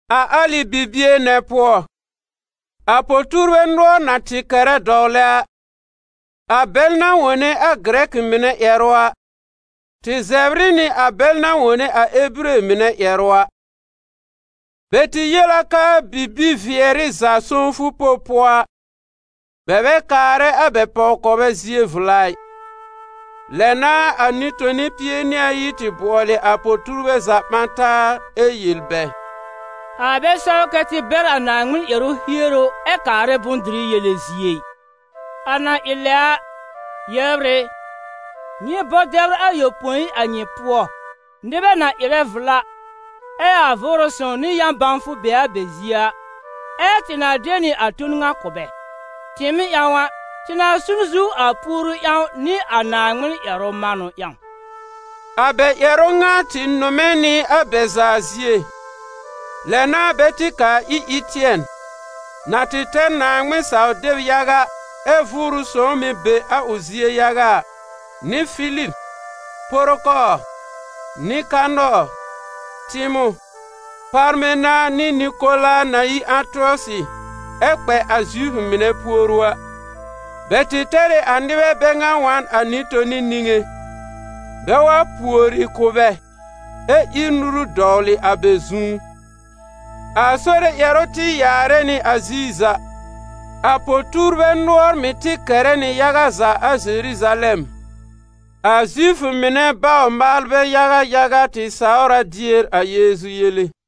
A alɩ bibie nɛ pʋɔ, a po-tuurbɛ nʋɔr na tɩ kɛrɛ dɔwlɛ a, a bɛl na wone a Gɩrɛkɩ mɩnɛ ƴɛrʋ a, tɩ zɛbr ɩ nɩ a bɛl na wone a Ebire mɩnɛ ƴɛrʋ a. Bɛ tɩ yel a k'aa bibi-vɩɛrɩ za sõwfʋ pob pʋɔ a, bɛ bɛ kaarɛ a bɛ pɔw-kɔbɛ zie vla ɩ. Lɛ n'a a nɩ-toni pie nɩ ayi tɩ bʋɔlɩ a po-tuurbɛ za ɓã taa ɛ yel bɛ: «A bɛ sɛw kɛ tɩ bɛr a Naaŋmɩn ƴɛrʋ hieru ɛ kaarɛ bʋ̃-dɩrɩ yele zie ɩ. A na ɩ lɛ a, yɛbr ɩ, nyɩ bɔ dɛbr ayopõi a nyɩ pʋɔ, nɩbɛ na ɩrɛ vla, ɛ a Vʋʋrʋ Sõw nɩ yã-bãwfʋ be a bɛ zie a, ɛ́ tɩ na de nɩ a ton ŋa kʋ̀ bɛ. Tɩɩm ƴãw a, tɩ na su n zu a puoru ƴãw nɩ a Naaŋmɩn ƴɛrʋ manʋ ƴãw.» A bɛ ƴɛrʋ ŋa tɩ nʋmɛ nɩ a bɛ za zie, lɛ n'a bɛ tɩ kaa ir Ɩtɩɛn, na tɩ tɛr Naaŋmɩn-saw-deb yaga ɛ Vʋʋrʋ Sõw mɩ̀ be a ʋ zie yaga a, nɩ Filib, Porokɔɔr, Nɩkanɔɔr, Tɩmɔ̃, Parmena nɩ Nɩkola na yi Ãtɩɔsɩ ɛ kpɛ a Zifʋ mɩnɛ puoru a. Bɛ tɩ tɛr ɩ a nɩbɛ bɛ ŋa wa n a nɩ-toni niŋé, bɛ wa pùori kʋ̀ bɛ ɛ ír nuru dɔwlɩ a bɛ zu. A Sore ƴɛrʋ tɩ yaarɛ nɩ a ziir za, a po-tuurbɛ nʋɔr mɩ̀ tɩ kɛrɛ nɩ yaga za a Zeruzalɛm. A Zifʋ mɩnɛ bawr-maalbɛ yaga yaga tɩ sawr a dier a Yeezu yele.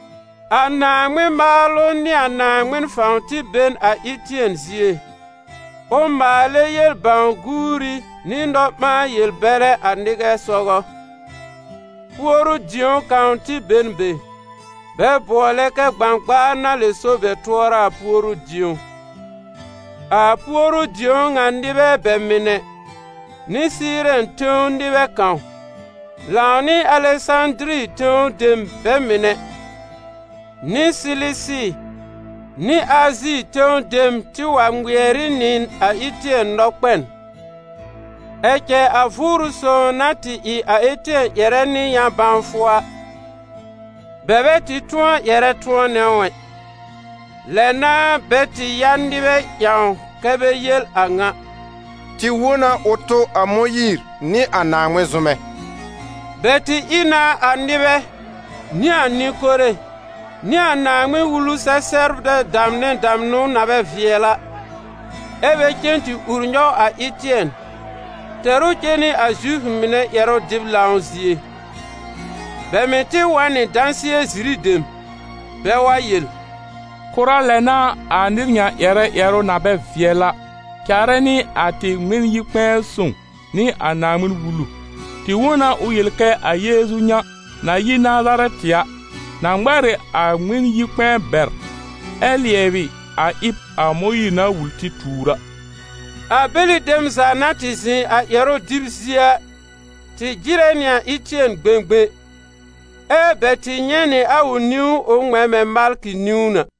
A Naaŋmɩn maalʋ nɩ a Naaŋmɩn fãw tɩ be n a Ɩtɩɛn zie, ʋ maalɛ yel-bãw-guuri nɩ nɔ-ɓãa-yel-bɛrɛ a nɩbɛ sɔgɔ. Puoru-dĩo kãw tɩ be n be, bɛ bʋɔlɛ kɛ Gbãgbaar na lɛ so bɛ tʋɔra a puoru-dĩo. A puoru-dĩo ŋa nɩbɛ bɛ mɩnɛ nɩ Sɩɩrɛn tẽw nɩbɛ kãw, lãw nɩ Alɛsãdiri tẽw dem bɛ mɩnɛ nɩ Silisi nɩ Azi tẽw dem tɩ wa ŋmɩɛr ɩ nɩ a Ɩtɩɛn nɔkpɛn. Ɛ cɛ a Vʋʋrʋ Sõw na tɩ ɩ a Ɩtɩɛn ƴɛrɛ nɩ yã-bãwfʋ a, bɛ bɛ tɩ tʋ̃ɔ ƴɛrɛ tʋ̃ɔnɛ ʋ ɛ. Lɛ n'a bɛ tɩ ya nɩbɛ ƴãw kɛ́ bɛ yel a ŋa: «Tɩ wõ na ʋ tʋ a Mõyiir nɩ a Naaŋmɩn zʋmɛ.» Bɛ tɩ ɩ na a nɩbɛ, nɩ a nɩ-kore nɩ a Naaŋmɩn-Wulu-sɛ-sɛbrbɛ damnɛ damnʋ na bɛ vɩɛl a, ɛ́ bɛ cen tɩ ur nyɔw a Ɩtɩɛn, tɛr ʋ cen nɩ a Zifʋ mɩnɛ ƴɛrʋ-dɩb-lãw zie. Bɛ mɩ̀ tɩ wa n nɩ dãsɩɛ-ziri dem, bɛ wa yel: «Kʋra lɛ n'a a nɩr ŋa ƴɛrɛ ƴɛrʋ na bɛ vɩɛl a, caarɛ nɩ a tɩ Ŋmɩn-yi-kpɛ̃ɛ sõw nɩ a Naaŋmɩn-Wulu. Tɩ wõ na ʋ yel kɛ a Yeezu ŋa, na yi Nazarɛtɩ a, na ŋmɛr ɩ a Ŋmɩn-yi-kpɛ̃ɛ bɛr ɛ lɩɛbɩ a ɩb a Mõyiir na wul tɩ tuur a.» A bɛlɩ dem za na tɩ zɩ̃ a ƴɛrʋ dɩb zie a tɩ jɩrɛ nɩ a Ɩtɩɛn gbẽgbẽ, ɛ́ bɛ tɩ nyɛ̃ nɩ a ʋ niwn ʋ ŋmɛ̃ mɛ̃ malkɩ niwn a.